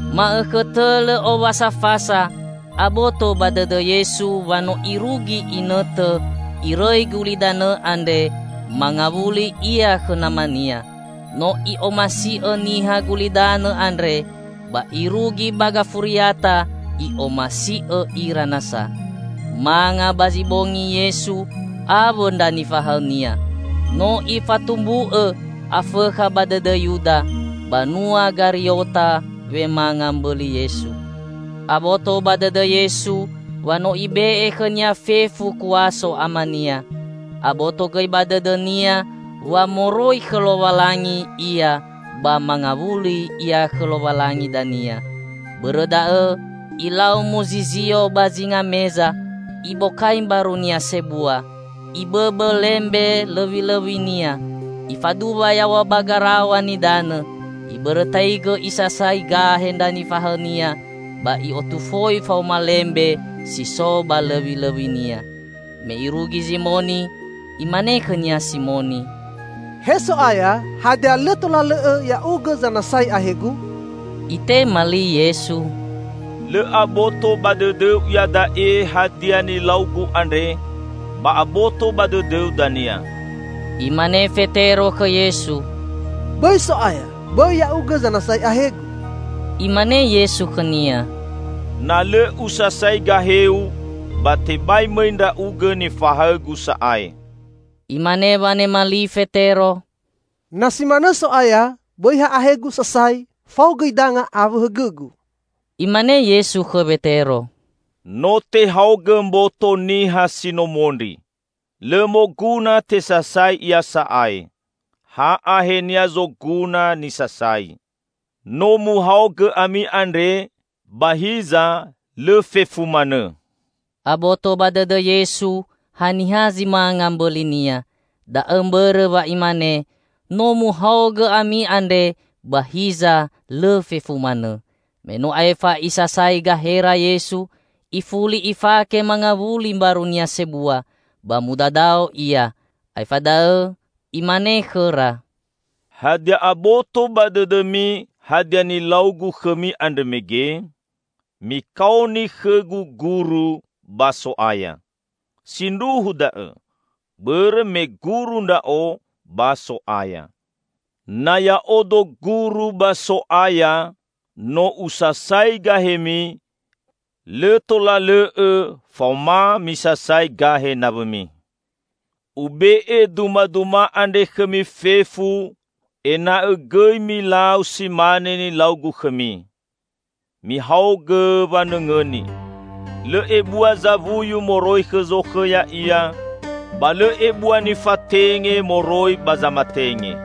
Ma'õkhõ tõ lõ Owasa Fasa, aboto ba dõdõ Yesu wa no irugi inõtõ Irõi gulidanõ andre mangawuli Ia khõ Nama-Nia. No I'omasi'õ niha gulidanõ andre, ba irugi ba gafuriata I'omasi'õ ira nasa. Manga ba zi bongi Yesu awõ ndra nifahaõ-Nia. No ifatumbu'õ Afõkha ba dõdõ Yuda, banua Gariota wemanga mbõli Yesu. Aboto ba dõdõ Yesu wa no Ibe'e khõ-Nia fefu kuaso Ama-Nia. Aboto gõi ba dõdõ-Nia wa moroi khõ Lowalangi Ia ba mangawuli Ia khõ Lowalangi dania. Bõrõ da'õ Ilau muzizio ba zinga meza, Ibokai mbaru-Nia sebua, Ibõbõ lembe lõwilõwi-Nia. Ifaduwa yaw̃a ba garaw̃a nidanõ, ibõrõtaigõ Isasai gahe ndra nifahaõ-Nia ba I'otufoi faoma lembe si so ba lõwilõwi-Nia. Me Irugi Zimoni, imane khõ-Nia Simoni, "He So'aya, hadia lõ tola lõ'õ Ya'ugõ zanasai ahegu?" Itema li Yesu, "Lõ aboto ba dõdõu iada'e hadia nilau-Gu andre, ba aboto ba dõdõu dania." Imane Fetero khõ Yesu, "Bõi, So'aya. Bõi Ya'ugõ zanasai ahegu!" Imane Yesu khõ-Nia, "Na lõ Usasai gaheu, ba tebai mõi ndra'ugõ nifahaõ-Gu sa'ae." Imane wanema li Fetero, "Na si manõ So'aya, bõi ha ahegu sasai, fao gõi danga awõ hõgõgu!" Imane Yesu khõ Wetero, "No tehaogõ mboto niha si no mondri. Lõ moguna tesasai ia sa'ae; ha ahenia zoguna nisasai. No muhaogõ ami andre, ba hiza lõ fefu manõ." (Aboto ba dõdõ Yesu haniha zi manga mbõli-Nia. Da'õ mbõrõ wa Imane, "No muhaogõ ami andre, ba hiza lõ fefu manõ.") Me no aefa Isasai gahera Yesu, ifuli Ifake mangawuli mbaru-Nia sebua, ba mudadao Ia. Aefa da'õ Imane khõra, "Hadia aboto ba dõdõmi hadia nilau-Gu khõmi andrõ mege? Mikaoni khõ-Gu Guru ba So'aya. Sindruhu da'õ: bõrõ me Guru Ndra'o ba So'aya. Na Ya'odo Guru ba So'aya, no usasai gahemi, lõ tola lõ'õ faoma misasai gahe nawõmi. Ube'e dumaduma andre khõmi fefu, ena'õ gõi milau si mane nilau-Gu khõmi. Mihaogõ wanõngõni: Lõ ebua zawuyu moroi khõ zokhõ ya'ia; ba lõ ebua nifatenge moroi ba zamatenge.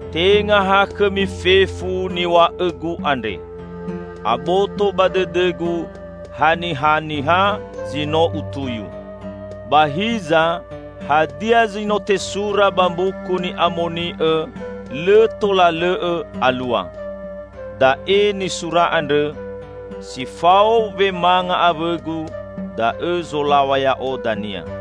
Tenga ha khõmi fefu niw̃a'õ-Gu andre. Aboto ba dõdõ-Gu hanihaniha zi no Utuyu. Ba hiza hadia zi no tesura ba Mbuku Ni'amoni'õ lõ tola lõ'õ alua; da'e nisura andrõ, 'Si fao wemanga awõ-Gu da'õ zolaw̃a Ya'o dania.'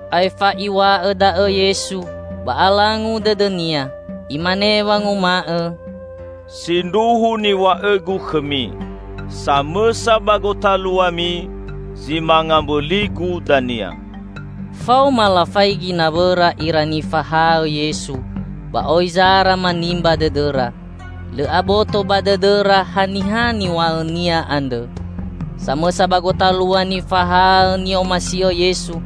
Aefa Iw̃a'õ da'õ Yesu, ba alangu dõdõ-Nia. Imane wanguma'õ, "Sindruhu niw̃a'õ-Gu khõmi: Samõsa ba gotaluami zi manga mbõli-Gu dania." Faoma lafaigi nawõra ira nifahaõ Yesu ba oi zara manimba dõdõra. Lõ aboto ba dõdõra haniha niw̃a'õ-Nia andrõ. Samõsa ba gotalua nifahaõ ni'omasi'õ Yesu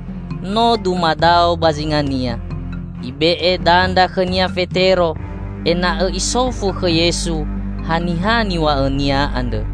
no dumadao ba zinga-Nia. Ibe'e dandra khõnia Fetero, ena'õ isofu khõ Yesu haniha niw̃a'õ-Nia andrõ.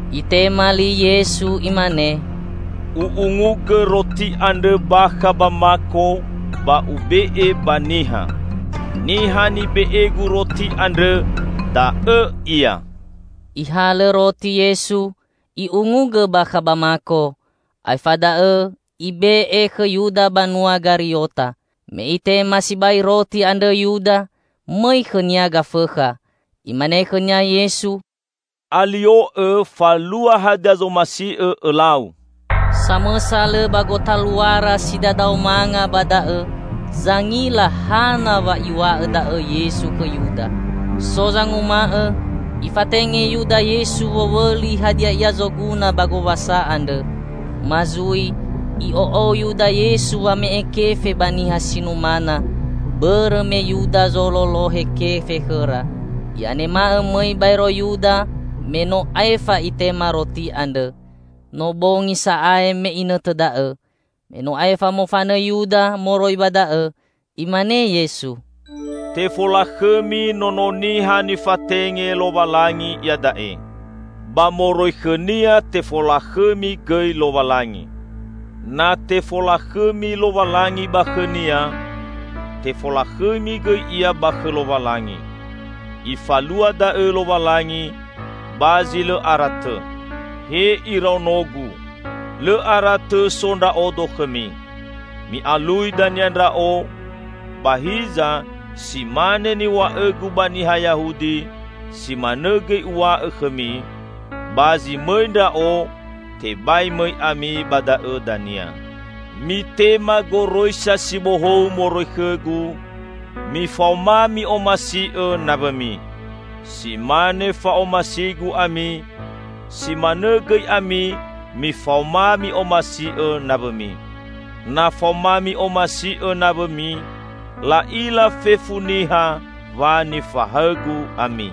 Itema li Yesu Imane, "U'ungugõ roti andrõ bakha ba mako, ba Ube'e ba niha. Niha nibe'e-Gu roti andrõ da'õ ia." Ihalõ roti Yesu, I'ungugõ bakha ba mako; aefa da'õ Ibe'e khõ Yuda banua Gariota. Me itema sibai roti andrõ Yuda, mõi khõnia Gafõkha. Imane khõnia Yesu, "Alio'õ falua hadia zomasi'õ õlau!" Samõsa lõ ba gotaluara si dadao manga ba da'õ zangila hana wa Iw̃a'õ da'õ Yesu khõ Yuda. So zanguma'õ, Ifatenge Yuda Yesu wowõli hadia ia zoguna ba gowasa andrõ, ma zui I'o'ou Yuda Yesu wame'e kefe ba niha si numana -- bõrõ me Yuda zololohe kefe khõra. I'anema'õ mõi baero Yuda me no aefa itema roti andrõ. No bongi sa'ae me inõtõ da'õ. Me no aefa mofanõ Yuda moroi ba da'õ, Imane Yesu, "Tefolakhõmi Nono Niha nifatenge Lowalangi iada'e. Ba moroi khõ-Nia tefolakhõmi gõi Lowalangi. Na tefolakhõmi Lowalangi ba khõ-Nia, tefolakhõmi gõi Ia ba khõ Lowalangi. Ifalua da'õ Lowalangi ba zi lõ ara tõ. He iraono-Gu, lõ ara tõ so Ndra'odo khõmi. Mi'alui dania Ndra'o, ba hiza si mane niw̃a'õ-Gu ba niha Yahudi, si manõ gõi Uw̃a'õ khõmi: ba zi mõi Ndra'o, tebai mõi ami ba da'õ dania. Mitema goroisa si bohou moroi khõ-Gu: mifaoma mi'omasi'õ nawõmi. Si mane fa'omasi-Gu ami, si manõ gõi ami mifaoma mi'omasi'õ nawõmi. Na faoma mi'omasi'õ nawõmi, la'ila fefu niha wa nifahaõ-Gu ami."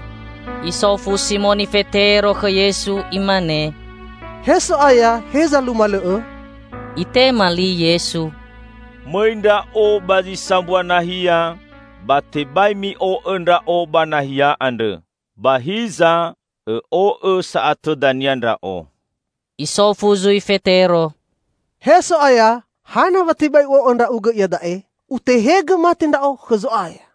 Isofu Simoni Fetero khõ Yesu, imane, "He So'aya heza numalõ'õ?" Itema li Yesu, "Mõi Ndra'o ba zi sambua nahia, ba tebai mi'o'õ Ndra'o ba nahia andrõ. Ba hiza õ'o'õ sa'atõ dania Ndra'o." Isofu zui Fetero, "He So'aya, hana wa tebai u'o'õ Ndra'ugõ iada'e. Utehegõ mate ndra'o khõ Zo'aya!"